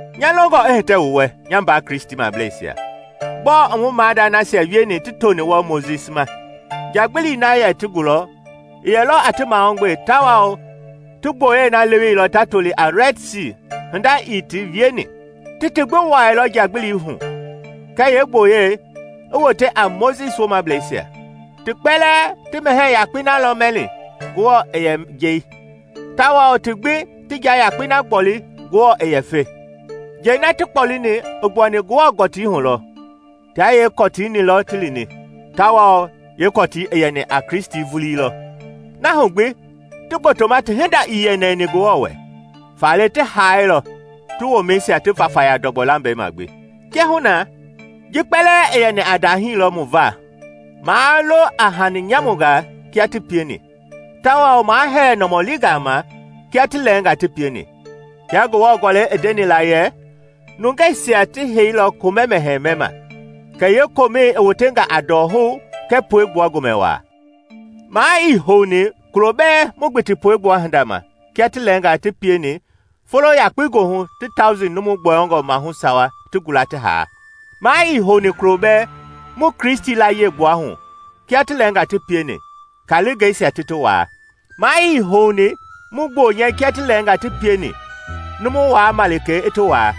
Nya longɔ i hitɛ wu wɛ, nya mbaa Kristimableisia, gbɔɔ i mu maadani nasia wieni ti toni wɔɔ Mojisi ma. Njagbili na yɛ ti gulɔ i yɛlɔ a ti mahugbe tawao ti gboyei na leweilɔ ta toli a Rɛd Sii hinda ii ti wieni. Ti ti gbi wuailɔ njagbilii hu kɛɛ yeegboyei, ti wote a Mojisi woomablɛisia. Ti kpɛlɛɛ ti mɛhɛɛ yakpei na mɛilɔ Ngewɔ i yɛ njei, tawao ti gbi ti nja yakpei na gboli Ngewɔ i yɛ fe. Njɛi na ti kpɔleni i gbuani Ngewɔ gɔtii hu lɔ, tia yeekɔtii-ni ti lini, tawao yeekɔtii i yɛni a Kristi vulii lɔ. Na hu gbi, ti gbotoma ti hinda ii yɛ nɛni Ngewɔ wɛ, faale ti haailɔ, ti womɛisia ti vayafaya ndɔgbɔ lambɛi ma gbi. Kiahuna, ji kpɛlɛɛ i yɛni a ndahii lɔ mu va maa lo a hani nyamungaa kia ti pieni, tawao maa hɛɛ nɔmɔlingaa ma kia ti lɛɛngaa ti pieni. Kia Ngewɔ Gɔlɛi i ndeni la yɛ, “Nungeisia ti heiilɔ komɛ-mɛhɛɛ mɛma, kɛ yeekomɛi i wotenga a ndɔhou kɛɛ puegbua gomɛ waa.” Maa ii houni kulo bɛɛ mu gbiti puegbua hinda ma kia ti lɛɛngaa ti pieni folo yakpei goohu ti tauji numu gbɔyɔngɔ maahu sawa ti gula ti haa. Maa ii houni kulo bɛɛ mu Kristi layie gbuahu kia ti lɛɛngaa ti pieni, kaalingɛisia ti ti waa. Maa ii houni mu gbonyɛ kia ti lɛɛngaa ti pieni numu Waa Malikei i ti waa.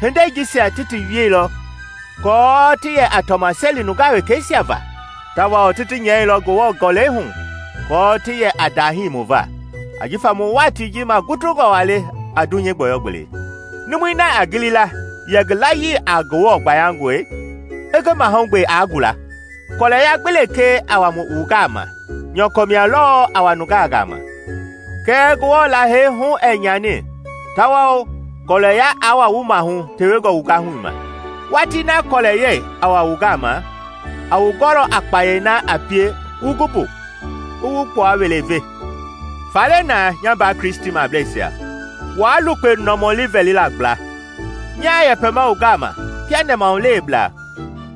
Hindei jisia ti ti wieilɔ aako ti yɛ a tɔmaseli nungaa wekeisia va, tawao ti ti nyɛilɔ Ngewɔ Gɔlɛi hu aako ti yɛ a ndahii mu va, ajifa mu watii ji magutungɔ waa le a dunyei gbɔyɔ-gbelei. Numui na i gilima yɛ ngi layii a Ngewɔ gbayangɔe, i ngi mahugbe aa gula. Kɔlɛya gbi lekee a wa wu gama, nyɔkɔ mia lɔɔ a wa nungaa gama. Kɛɛ Ngewɔ Lahei hu ɛɛ nyani tawao kɔɔlɛya aa wa wu maahu tewengɔ wu gahui ma. Watii na kɔɔlɛyɛi a wa wu gama, a wu gɔlɔ a kpayei na a pie wu gu mbu, i wu gbua-wele ve. Faale na, nya mbaa Kristimableisia waa lukpe nɔmɔli vɛlila gbla. Nyaa yɛpɛma wu gama kia nɛmahuleweblaa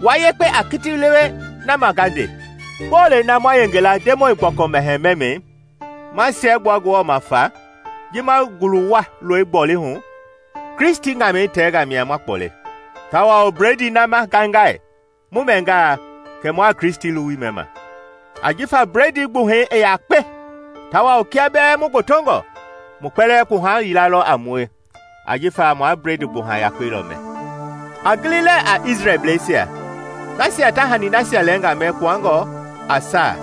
wua yekpe a kiti lewe na ma nga nde. Bolei na ma yenge la Ndemɔi Gbɔkɔ Mɛhɛɛ mɛmɛi, ma siɛgbua Ngewɔ ma fa; ji ma ngulu-wua lɔi gboli hu, Kristi ŋamɛi tɛngaa mia ma kpɔle. Tawao bledii na ma ngaingai: mu mɛngaa, kɛ mua Kristi luwui mɛma. Ajifa bledii gbuhɛi i yakpe, tawao kia bɛɛ mu gbotongɔ, mu kpɛlɛɛ kpuha yila lɔ a mue jifa ma bledii gbuha yakpei lɔ mɛ. A gili lɛɛ a Isrelbleisia; nasia ta hani nasia lɛɛngaa mɛ kpuangɔ a saa,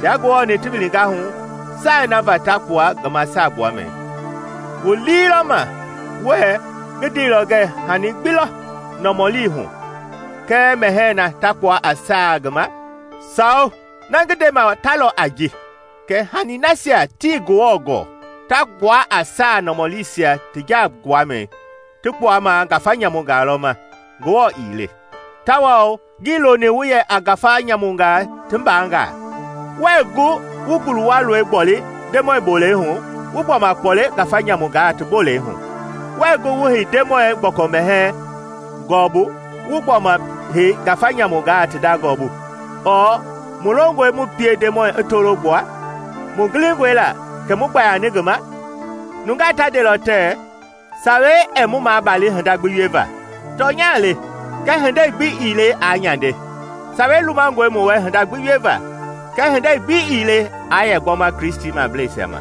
tia Ngewɔ-ni ti wilinga hu, saai na va ta kpua ngi ma saagbuamɛi. Wu lii lɔ ma wue ngi ndeilɔ ngɛɛ hani gbi lɔ nɔmɔlii hu kɛɛ mɛhɛɛ na ta kpua a saa ngi ma? Sawo! Na ngi ndema ta lɔ a ji kɛ hani na nasia tii Ngewɔ gɔɔ ta kpua a saa nɔmɔliisia ti jaa-gbuamɛi ti kpuama ngafa nyamungaa lɔ ma, Ngewɔ ii le; tawao ngii loni wu yɛ a ngafa nyamungaa ti mbangaa. Wuɛɛ gu wu ngulu-wua lɔi gboli Ndemɔi bolei hu wu gbɔma kpɔle ngafa nyamungaa ti bolei hu; wuɛɛ gu wu hei Ndemɔi Gbɔkɔ Mɛhɛɛ gɔɔbu wu gbɔma hei ngafa nyamungaa ti nda gɔɔbu. Ɔɔ mu longɔe mu pie Ndemɔi i tolo gbua? Mu gilingɔe la kɛ mu gbayani ngi ma? Nunga ta ndelɔ tɛɛ, “Sawei ɛɛ mu maabali hinda gbi wieva.” Tɔnya le, kɛɛ hindei gbi ii le aa nyande. Sawei lumangɔe mu wɛ hinda gbi wieva, kɛɛ hindei gbi ii le a yɛ gbɔma Kristimableisia ma.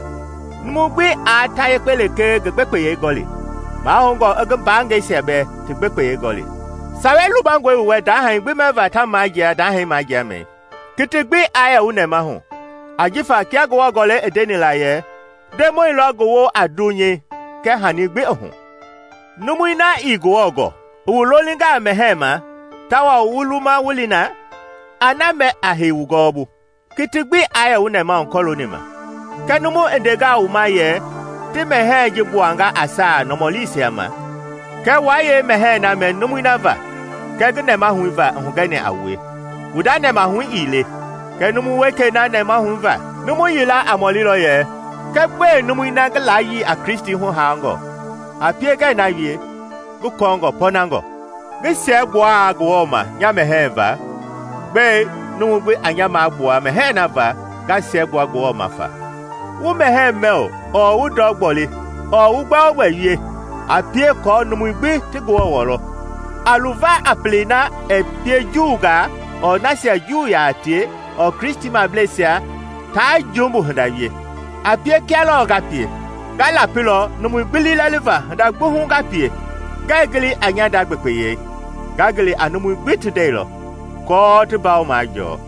Numu gbi aa ta yekpe lekee ngi gbekpeyei gɔli, mahoungɔ i ngi mbaangɛisia bɛɛ ti gbekpeyei gɔli. Sawei lumangɔe wu wɛ ndahɛi gbi mɛva ta majia ndaahɛ majiamɛi, kiti gbi aa yɛ wu nɛmahu. Ajifa kia Ngewɔ Gɔlɛi i ndeni la yɛ, “Ndemɔi lɔ ngi woo a dunyei kɛɛ hani gbi i hu.” Numui na ii Ngewɔ gɔɔ i wu lolingaa mɛhɛɛ ma tawao wu luma wu li na, a na mɛ a hei wu gɔɔbu. Kiti gbi aa yɛ wu nɛmahu kɔlooni ma. Kɛɛ numu i ndengaa wu ma yɛ, “Ti mɛhɛɛ ji gbuanga a saa nɔmɔliisia ma,” kɛ waa yeemɛhɛɛ na mɛ numui na va kɛɛ ngi nɛmahu va i hugɛni a wue wu nda nɛmahu ii le, kɛ numu wekei na nɛmahu va. Numu yila a mɔlilɔ yɛ, “Kɛ gbɛe numui na ngi layii a Kristi huhaangɔ a pie ngɛɛ na wie ngi kɔɔngɔ pɔɔnangɔe? Ngi siɛgbuangaa Ngewɔ ma nya mɛhɛɛ va, gbɛe numu gbi a nya magbua mɛhɛɛ na va nga siɛgbua Ngewɔ ma?” Wu mɛhɛɛ mɛ ɔɔ wu ndɔ gboli ɔɔ wu gbɛogbɛ wie, a pie aako numui gbi ti Ngewɔ wɔlɔ. A luva a pelei na ɛɛ pie Juungaa, ɔɔ nasia Juu yaa tie, ɔɔ Kristimableisia taa jumbu hinda wie. A pie kia lɔɔ nga pie; nga lapilɔ numui gbi liilɛliva hinda gbi hu nga pie, ngɛɛ gili a nya nda gbekpeyei, nga gili a numui gbi ti ndɛi lɔ, aako ti mbawo majɔɔ.